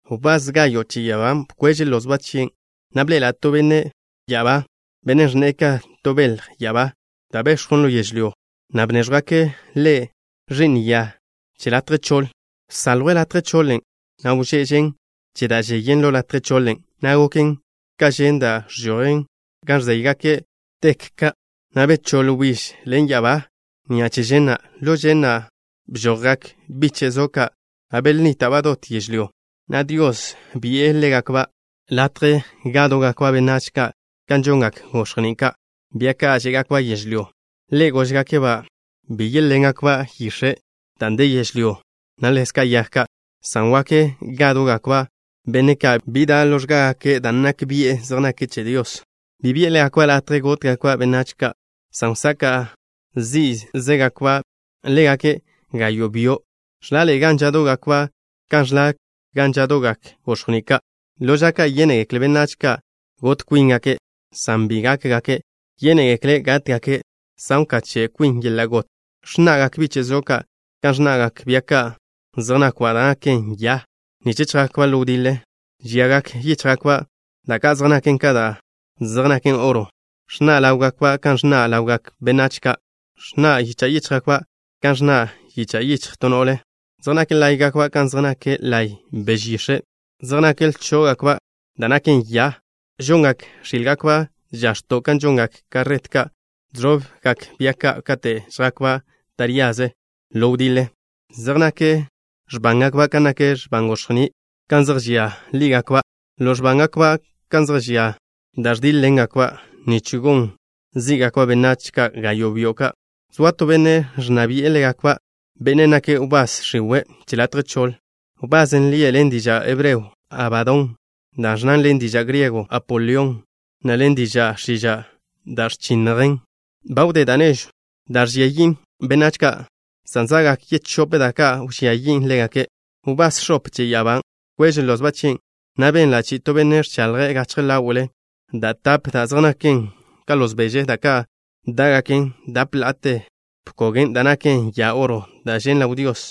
Wbás gayo' che ya'abá bkweže' lozba' chien', na' bḻe'ela' to benne' ya'abá, benne' ẕnne'e ka to belj ya'abá da' bex̱jwn ḻo yežlyó, na' bnéẕjwgake' ḻe' ẕi'n ya che latje choḻ. Bsaljwe' latje choḻen', na' wžén žen che da' žeyen ḻo latje choḻen', na' goken ka žen da' ẕžojen gan ẕzéygake' bzodo' ka', na' bechóḻ wbíž ḻen ya'abá ni'a che žen na'. Ḻo žen na' bžojgak biche' zo ka', na' belẕoaba' dot yežlyó, na' Dios bi'e ḻégakba' latje gádo'gakba' benách ka' kan žongak gox̱jní' ka', bia ka' žé'gakba' yežlyó. Ḻe' góžgake'-ba' bi yéḻengakba' yix̱e' dan' de yežlyón', na' ḻezka' yag ka', san wak gádo'gakba' benne' ka' bi da' ḻo x̱gágake' dan' nak bian' zej nake' che Dios. Bi bi'e ḻégakba' latje gótgakba' benách ka', san wsaka' zí'zegakba' ḻégake' gayo' byo'. Ẕlaḻe'e gan žádo'gakba' kan ẕla gan žádo'gak gox̱jní' ka'. Ḻo ža ka' yénegekle benách ka' got kwíngake', san bi gákgake'. Yénegekle' gátgake' san wkache' kwin yeḻa' got. Ẕnna'gak biche' zo ka' kan ẕnna'gak bia ka' zej nákwba' da' naken ya, nich chjakba' ḻo wdiḻe. Žiagak yíchjgakba' da' ka' zej naken ka da' ka' zej naken oro. Ẕnna' ḻáwgakba' kan ẕnna' ḻawgak benách ka'. Ẕnna' yicha' yíchjgakba' kan ẕnna' yicha' yichj to no'le. Zej nak láye'gakba' kan zej nak laye' beže yix̱e'. Zej nakw lchó'gakba' da' naken ya. Žongak x̱ílgakba' žax̱to' kan žongak karret ka' žẕobgak bia ka' kate' zjakba' taríaze ḻo wdiḻe. Zej nak x̱bángakba' kan nak x̱ban gox̱jní', gan zej žia ḻí'gakba'. Ḻo x̱bángakba' ka' zej žia da' ẕdíḻ-ḻengakba', nich gon zí'gakba' benách ka' gayo' byo' ka'. Zoa to benne' ẕnna bi'e ḻégakba', bennen' nake' wbás x̱iwe' che latje choḻ. Wbasen' lie' ḻen diža' hebreo: Abadón, da' ẕnnan ḻen diža' griego: Apolión, na' ḻen diža' x̱iža': Da' Ẕchinnjen. Ba wdé da' nežw da' ẕžia yin' benách ka', san za'gak yechóp da' ka' wžía yin' ḻégake'. Wbás x̱ope che ya'abá bkweže' lozba' chien', na' benla' chi'i to benne' ẕchaḻje' gachje ḻáwe'le da' tape da' zej naken ka loz beže, da' ka' dá'gaken dape la'ate bkogen' da' naken ya oro, da' žen' ḻaw Dios.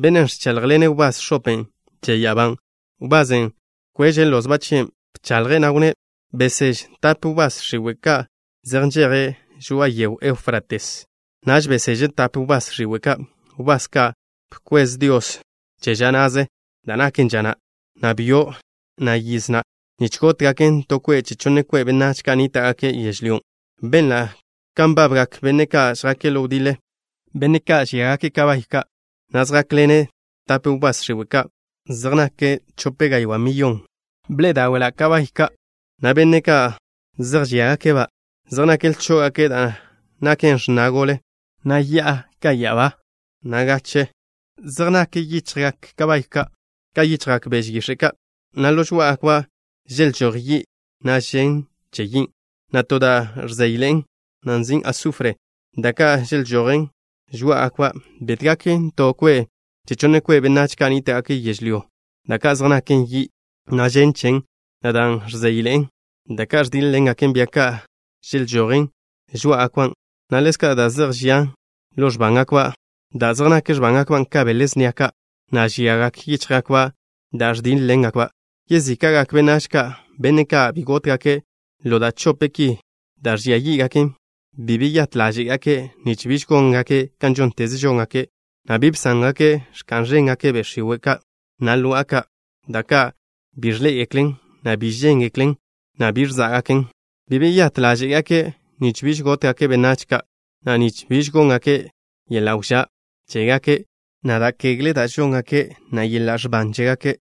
Bennen' ẕcháḻjḻene' wbás x̱open' che ya'abá, wbasen' bkweže' lozba' chien'. Bchaḻje', na' wnné': “Beseže tape wbás x̱iwe' ka' zej nžejen žoa'a yegw Éufrates.” Naž beseže' tape wbás x̱iwe' ka', wbás ka' bkwez Dios che ža na'ze, da' naken ža na', na' byo' na', na' yiz na', nich gótgaken to kwe' che chonne kwe' benách ka' nníta'gake' yežlyó. Benla' kan nbabgak benne' ka' žjake' ḻo wdiḻe, benne' ka' žíagake' bia ka', na' zjákḻene' tape wbás x̱iwe' ka'. Zej nake' chope gaywá' mil mile'. Bḻe'e dáwe'la' bia ka', na' benne' ka' zej žíagake'-ba' zej nakw lchó'gake' da' naken x̱na gole, na' ya'a ka ya'abá, na' gache. Zej nak yichjgak bia ka' ka yichjgak beže yix̱e' ka', na' ḻo žoá'agakba' želžój yi', na' žen che yin', na' to da' ẕzeyḻe'en, da' nzin' sufre. Da' ka' želžojen žoá'agakba' bétgaken to kwe' che chonne kwe' benách ka' nníta'gake' yežlyó, da' ka' zej naken yi', na' žen chen, na' dan' ẕzeyḻe'en. Da' ka' ẕdíḻ-ḻengak bia ka' želžojen žoá'agakba', na' ḻezka' da' zej žian ḻo x̱bángakba' dan' zej nak x̱bángakba' ka bele snia ka', na' žiagak yíchjgakba' da' ẕdíḻ-ḻengakban'. Yezíka'gak benách ka', benne' ka' bi gótgake' ḻo da' chope ki da' ẕžia yí'gaken, bi beyát ḻáže'gake' nich biž góngake' kan žónteze žóngake', na' bi bsángake' ẕka'n ẕéngake' be' x̱iwe' ka', na' lo'a ka', da' ka' bi ẕḻé'egeklen, na' bi žéngeklen, na' bi ẕzá'gaken. Bi beyát ḻáže'gake' nich biž gótgake' benách ka', na' nich biž góngake' yeḻa' wžá' chégake', na' da' ẕia da' žóngake', na' yeḻa' ẕban chégake'.